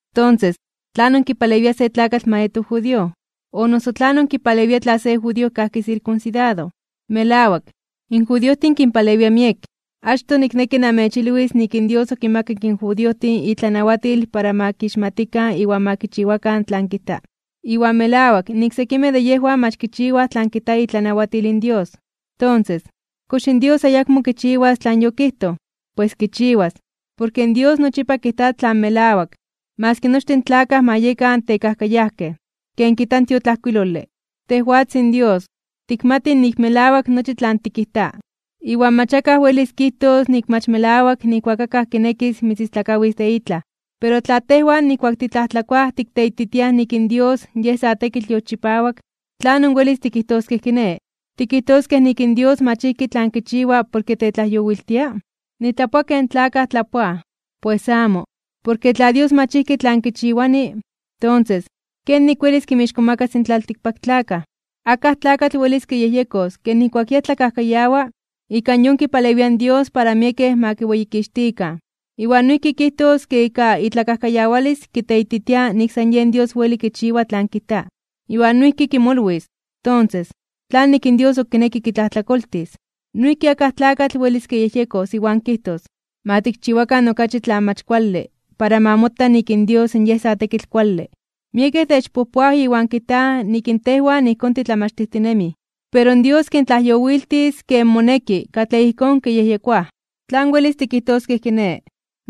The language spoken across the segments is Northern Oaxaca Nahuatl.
Tonses, ¿tlanon kipalewia se tlakatl ma yeto judío? ¿O noso tlanon kipalewia tla se judío kajki sirkunsidado? Melawak, in judiojtin kinpalewia miek. Achtoj nikneki namechilwis nik in Dios okinmakak in judiojtin itlanawatil para ma kixmatikan iwan ma kichiwakan tlan kijta. Iwan melawak nik sekimej de yejwan mach kichiwaj tlan kijta itlanawatil in Dios. Tonses, ¿kox in Dios ayakmo kichiwas tlan yokijtoj? ¡Pues kichiwas! Porke Dios nochipa kijta tlan melawak, maski nochtin in tlakaj ma yekan tekajkayajkej. Ken kijta in tiotlajkuilole: Tejwatzin Dios, tikmatij nik melawak nochi tlan tikijta, iwan mach akaj welis kijtos nik mach melawak nijkuak akaj kinekis mitzistlakawis de itlaj. Pero tla tejwan nijkuak titlajtlakoaj tikteititiaj nik in Dios Yej sa tekitl yolchipawak, ¿tlan welis tikijtoskej kiné? ¿Tikijtoskej nik in Dios mach ijki tlan kichiwa porke techtlajyowiltia? (Nitlapoa ken tlapoaj in tlakaj.) ¡Pues amo! Porke tla Dios mach ijki tlan kichiwani, tonses, ¿kenik welis kinmixkomakas in tlaltikpaktlakaj? Akaj tlakatl welis kiyejyekos ke nijkuak yej tlakajkayawa ika yon kipalewia in Dios para miekej ma kiweyikixtikan, iwan noijki kijtos ke ika itlakajkayawalis kiteititia nik san yen Dios weli kichiwa tlan kijta. Iwan noijki kimolwis, tonses, ¿tlanik in Dios ok kineki kitlajtlakoltis? Noijki akaj tlakatl welis kiyejyekos iwan kijtos: “Ma tikchiwakan okachi tlan mach kuale para ma mota nik in Dios Yej sa tekitl kuale”. Miekej techpojpoaj iwan kijtaj nik in tejwan ijkón titlamachtijtinemij. Pero Dios kintlajyowiltis ken moneki katlej ijkón kiyejyekoaj. ¿Tlan welis tikijtoskej kiné?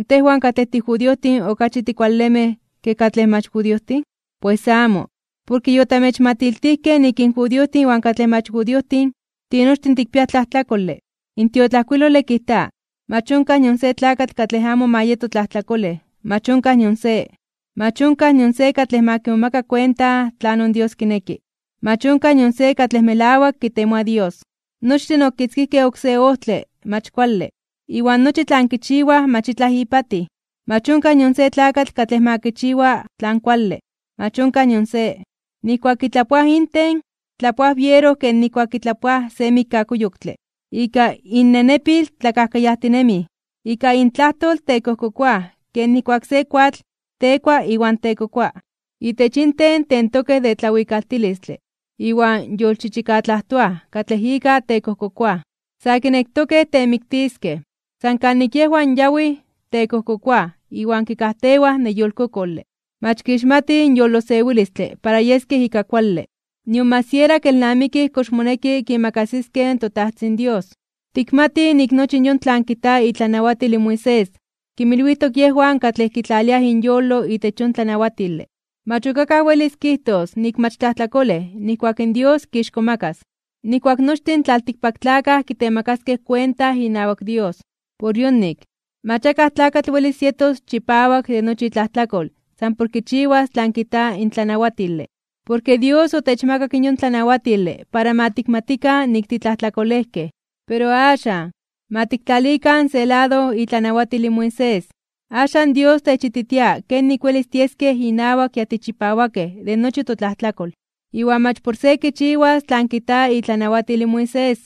¿Tejwan katlej tijudiojtin okachi tikualemej ke katlej mach judiojtin? ¡Pues amo! Porke yotamechmatiltijkej nik in judiojtin iwan katlej mach judiojtin, tinochtin tikpiaj tlajtlakole. In tiotlajkuilole kijta: Mach onkaj nion se tlakatl katlej amo ma yeto tlajtlakolej, mach onkaj nion se. Mach onkaj nion se katlej ma kimomaka kuenta tlanon Dios kineki, mach onkaj nion se katlej melawak kitemoa Dios. Nochtin okitzkijkej oksé ojtle mach kuale, iwan nochi tlan kichiwaj mach itlaj ipatij. Mach onkaj nion se tlakatl katlej ma kichiwa tlan kuale, mach onkaj nion se. Nijkuak kitlapoaj inten, tlapoaj biero ken nijkuak kitlapoaj se mikkakuyoktle. Ika innenepil tlakajkayajtinemij. Ika intlajtol tekojkokoaj ken nijkuak se koatl tekua iwan tekokoa. Itech inten tentokej de tlawikaltilistle iwan yolchichikatlajtoaj katlej ika tekojkokoaj. Sa kinektokej temiktiskej. San kanik yejwan yawij, tekojkokoaj iwan kikajtewaj neyolkokole. Mach kixmatij in yolosewilistle para yeskej ika kuale. Nion mach siera kelnamikij kox moneki kiimakasiskej in toTajtzin Dios. Tikmatij nik nochi yon tlan kijta itlanawatil in Moisés, kinmilwijtok yejwan katlej kitlaliaj inyolo itech yon tlanawatile. Mach ok akaj welis kijtos nik mach tlajtlakolej nijkuak in Dios kixkomakas (kitzonmanas), nijkuak nochtin in tlaltikpaktlakaj kitemakaskej kuenta inawak Dios. Por yonik, mach akaj tlakatl welis yetos chipawak de nochi itlajtlakol san por kichiwas tlan kijta in tlanawatile. Porke Dios otechmakak yon tlanawatile para ma tikmatikan nik titlajtlakolejkej. Pero axan, ma tiktlalikan se lado itlanawatil in Moisés, axan Dios techititia kenik welis tieskej inawak ya tichipawakej de nochi totlajtlakol, iwan mach por se kichiwas tlan kijta itlanawatil in Moisés.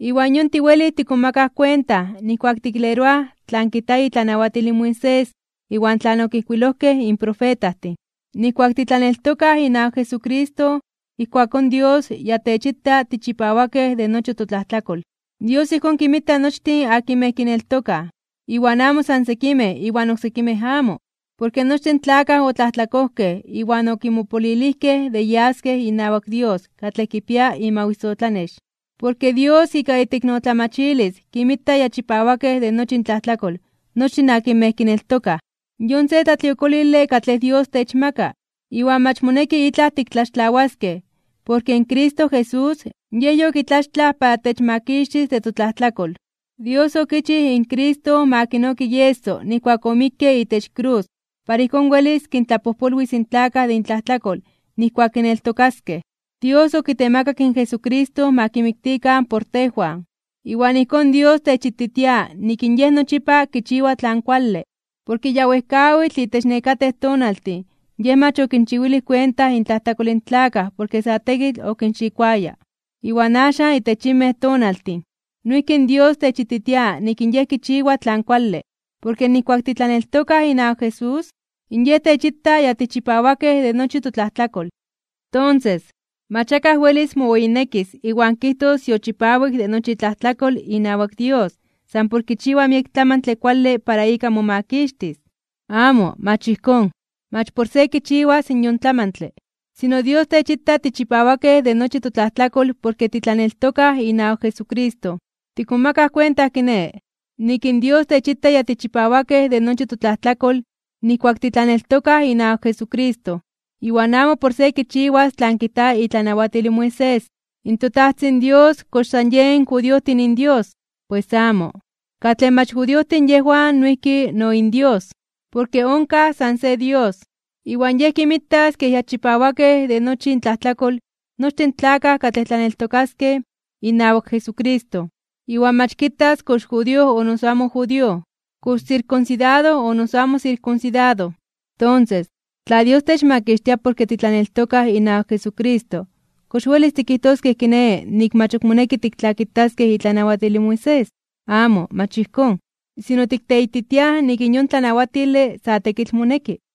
Iwan yon tiwelij tikmomakaj kuenta nijkuak tikleroaj tlan kijta itlanawatil in Moisés iwan tlan okijkuilojkej in profetajtin. Nijkuak titlaneltokaj inawak Jesucristo ijkuakón Dios ya techita tichipawakej de nochi totlajtlakol. Dios ijkón kinmita nochtin akinmej kineltokaj, iwan amo san sekimej iwan oksekimej amo. Porke nochtin tlakaj otlajtlakojkej iwan okimopolilijkej de yaskej inawak Dios katlej kipia imawisotlanex. Pero Dios ika iteiknotlamachilis kinmita ya chipawakej de nochi intlajtlakol nochtin akinmej kineltokaj. Yon se tlatliokolile katlej Dios techmaka, iwan mach moneki itlaj tiktlaxtlawaskej porke in Cristo Jesús Yej yokitlaxtlaj para techmakixtis de totlajtlakol. Dios okichij in Cristo ma kinoki ieso nijkuak omikke itech krus para ijkón welis kintlapojpolwis in tlakaj de intlajtlakol nijkuak kineltokaskej. Dios okitemakak in Jesucristo ma kimiktikan por tejwan, iwan ijkón Dios techititia nik in Yej nochipa kichiwa tlan kuale. Porke ya wejkawitl itech nekatej tonaltin Yej mach okinchiwilij kuenta intlajtlakol in tlakaj porke sa tekitl okinxikoaya. Iwan axan itech yinmej tonaltin, noijki in Dios techititia nik in Yej kichiwa tlan kuale, porke nijkuak titlaneltokaj inawak Jesús, in Yej techita ya tichipawakej de nochi totlajtlakol. Tonses, mach akaj welis moweyinekis iwan kijtos yochipawik de nochi itlajtlakol inawak Dios san por kichiwa miek tlamantle kuale para ika momakixtis. Amo, mach ijkón, mach por se kichiwas yon tlamantle. Sino Dios techita tichipawakej de nochi totlajtlakol porke titlaneltokaj inawak Jesucristo. Tikmomakaj kuenta kiné, nik in Dios techita ya tichipawakej de nochi totlajtlakol nijkuak titlaneltokaj inawak Jesucristo, iwan amo por se kichiwas tlan kijta itlanawatil in Moisés. ¿In toTajtzin Dios kox san yen judiojtin inDios? ¡Pues amo! Katlej mach judiojtin yejwan noijki no inDios. Porke onkaj san se Dios. Iwan Yej kinmitas kej ya chipawakej de nochi intlajtlakol, nochtin in tlakaj katlej tlaneltokaskej inawak Jesucristo, iwan mach kitas kox judío o noso amo judío, kox sirkunsidado o noso amo sirkunsidado. Tonses, tla Dios techmakixtia porke titlaneltokaj inawak Jesucristo, ¿kox welis tikijtoskej kiné nik mach ok moneki tiktlakitaskej itlanawatil in Moisés? Amo, mach ijkón. Sino tikteititiaj nik in yon tlanawatile sa tekitl moneki.